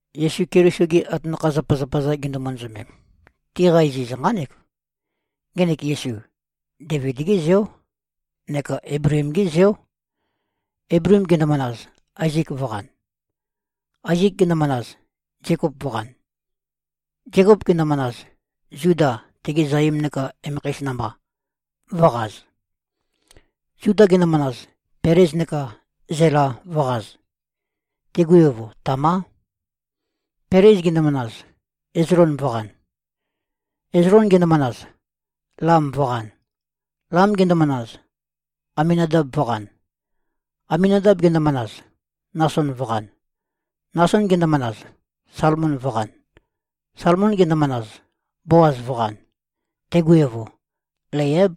Yesu Keliso-gi atanakha-zapazapa-za gindu-manazømem, tiqa iziz nqánek. Ngenek Yesu, Deivid-gé zeó neka Eibleem-gé zeó. Eibleem gendomanaz, Aezek vø̄qan. Aezek gendomanaz, Zekop vø̄qan. Zekop gendomanaz, Zuda, tegi zaim neka emekheis namba, vø̄qaz. Zuda gendomanaz, Pelez neka Zela vø̄qaz. Tigu evo, Tamá. Pelez gendomanaz, Ezlon vø̄qan. Ezlon gendomanaz, Lam vø̄qan. Lam gendomanaz, Aminadab vø̄qan. Aminadab gendomanaz, Nason vø̄qan. Nason gendomanaz, Salmon vø̄qan. Salmon gendomanaz, Boaz vø̄qan. Tegu evo, Leiáb.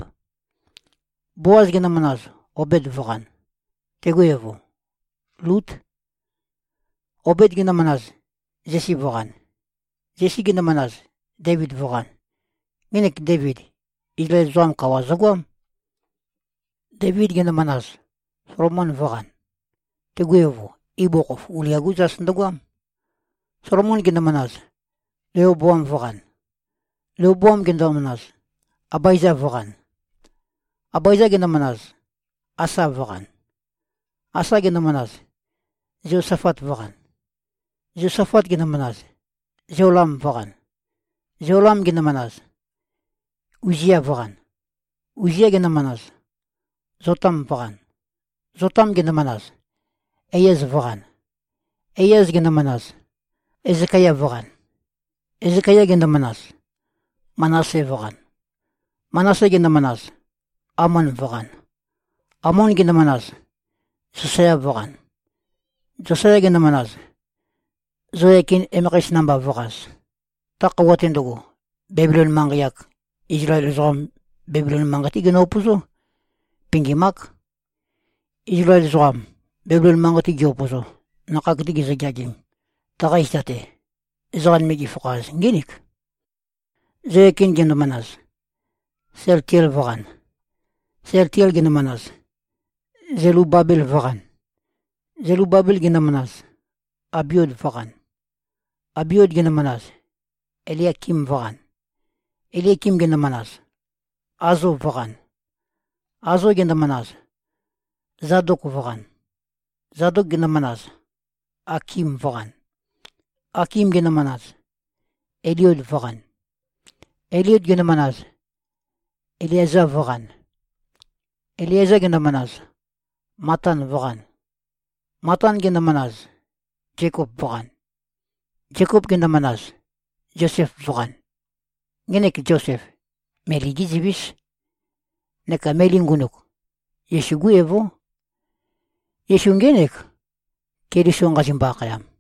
Boaz gendomanaz, Obed vø̄qan. Tegu evo, Lút. Obed gendomanaz, Zesi vø̄qan. Zesi gendomanaz, Deivid vø̄qan. Ngenek Deivid, Izlael ezoqam kawa zøgoám. Deivid gendomanaz, Solomon vø̄qan. Tegu evo, ibugukhokhof Ulia-gú zas ndøgoám. Solomon gendomanaz, Leoboam vø̄qan. Leoboam gendomanaz, Abaeza vø̄qan. Abaeza gendomanaz, Asa vø̄qan. Asa gendomanaz, Zeosafat vø̄qan. Zeosafat gendomanaz, Zeolam vø̄qan. Zeolam gendomanaz, Uzia vø̄qan. Uzia gendomanaz, Zotam vø̄qan. Zotam gendomanaz, Eiaz vø̄qan. Eiaz gendomanaz, Ezekaya vø̄qan. Ezekaya gendomanaz, Manase vø̄qan. Manase gendomanaz, Amon vø̄qan. Amon gendomanaz, Zosaya vø̄qan. Zosaya gendomanaz, Zeoyakin, emekheis namba, vø̄qaz. Ta khøuwa-te ndøgo, Bebilon manqei-ak, Izlael ezoqam, Bebilon manqei-té ginø-upøzó. Pingim-ák. Izlael ezoqam Bebilon manqei-te gi-upøzo, nakhag-te gizøgeagim, taqa zita-te, ezoqa nøme gifakhaz, ngínik: Zeoyakin gendomanaz, Sealtiel vø̄qan. Sealtiel gendomanaz, Zelubabel vø̄qan. Zelubabel gendomanaz, Abiud vø̄qan. Abiud gendomanaz, Eliakim vø̄qan. Eliakim gendomanaz, Azo vø̄qan. Azo gendomanaz, Zadok vø̄qan. Zadok gendomanaz, Akim vø̄qan. Akim gendomanaz, Eliud vø̄qan. Eliud gendomanaz, Eleaza vø̄qan. Eleaza gendomanaz, Matan vø̄qan. Matan gendomanaz, Zekop vø̄qan. Zekop gendomanaz, Zosef vø̄qan. Ngenek Zosef, Meli-gé zivís. Neka Meli ngunuk, Yesu-gú evó. Yesu, ngének, Keliso nqazimbo-akhayam.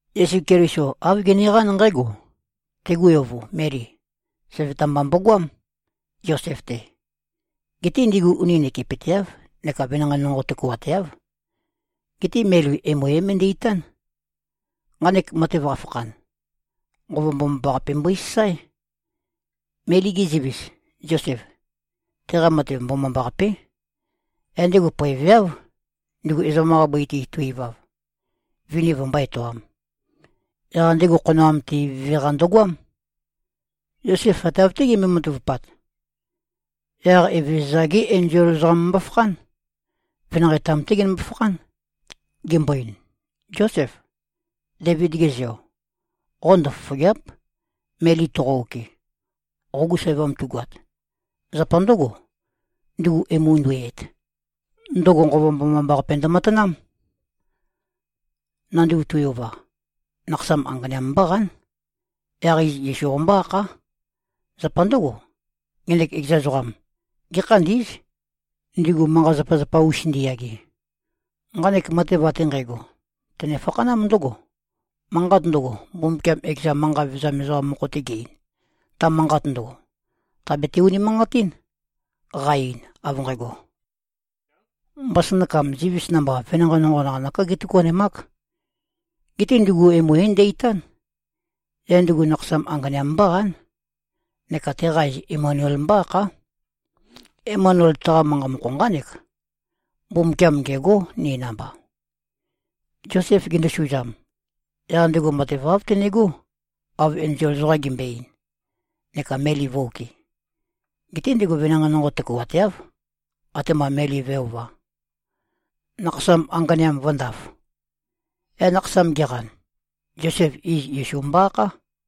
Yesu Keliso āv geneqán nqǽgo: Tegu evo, Meli, søvøta mba mbogoám, Zosef-te. Geté ndigu uni nøkepøteáv neka venanqei nonqo tøkuateáv. Geté Meli emu é-møndæ-itán. Nqanek matev qambo-fakhan, Nqova Mbomambaqape mbøisasáe. Meli-ge zivis, Zosef, teqa matev mbomambaqapé, yaq ndego poeveáv, ndugu ezoqam-qa bøi-te to꞉-ivav, mivi vømbó-etoām. Yaq ndego khonoam-te ivøve-qa ndøgoám. Zosef ate av-té gembøe-matavupat, yaq Evezøza-gé enzol ezoqam mbofakhán. Venanqei-tam-té genømbo-fakhán, gembo-ein, “Zósef, Deivid-ge zeo, qo ndøfofògea᷄p, Meli toqo-okɨ, qogu sævam tugoat. Zapa ndǿgo, ndugu emu nduiyæt, ndøgo Nqova Mbomambaqape ndømatanám. Nanduv tui-ova, nakhasam anganeam mbóqán. Yaq iz Yesu qombó-akhá. Zapa ndǿgo, ngenek ekeza ezoqam, gékhandí꞉z, ndigu manqa-zapazapa-us ndiyage.” Nqanek matev ate nqægo, tøne-fakhanám ndǿgo: Manqat ndøgo, Mbumbukiam ekeza manqa vevezam ezoqam mokho-te ge-ein, ta manqat ndøgo, tàbete-unimanqatín, qa-ein av nqægo, “Mbasønakam zivis namba venanqei nonqo, naqanøká gétøkuanemák. Geté ndugu emu é-ndæ-itán. Yaq ndugu nakhasam anganeam mbóqán. Neka teqa iz ‘Emanuel’ mbó-akhá.” Emanuel, taqa manqa mokho nqánek, “Mbumbukiam ngêgó, ni namba.” Zosef gendosuzam, yaq ndego matev āv tenegó, av enzol ezoqam gembøe-ein, neka Meli vø̄-okɨ. Geté ndigu venanqei nonqo tøkuateáv, atema Meli vø̄e-ova, nakhasam anganeam vø̄ndaf. Yaq nakhasam geqan, Zosef, iz Yesu mbo-akhá.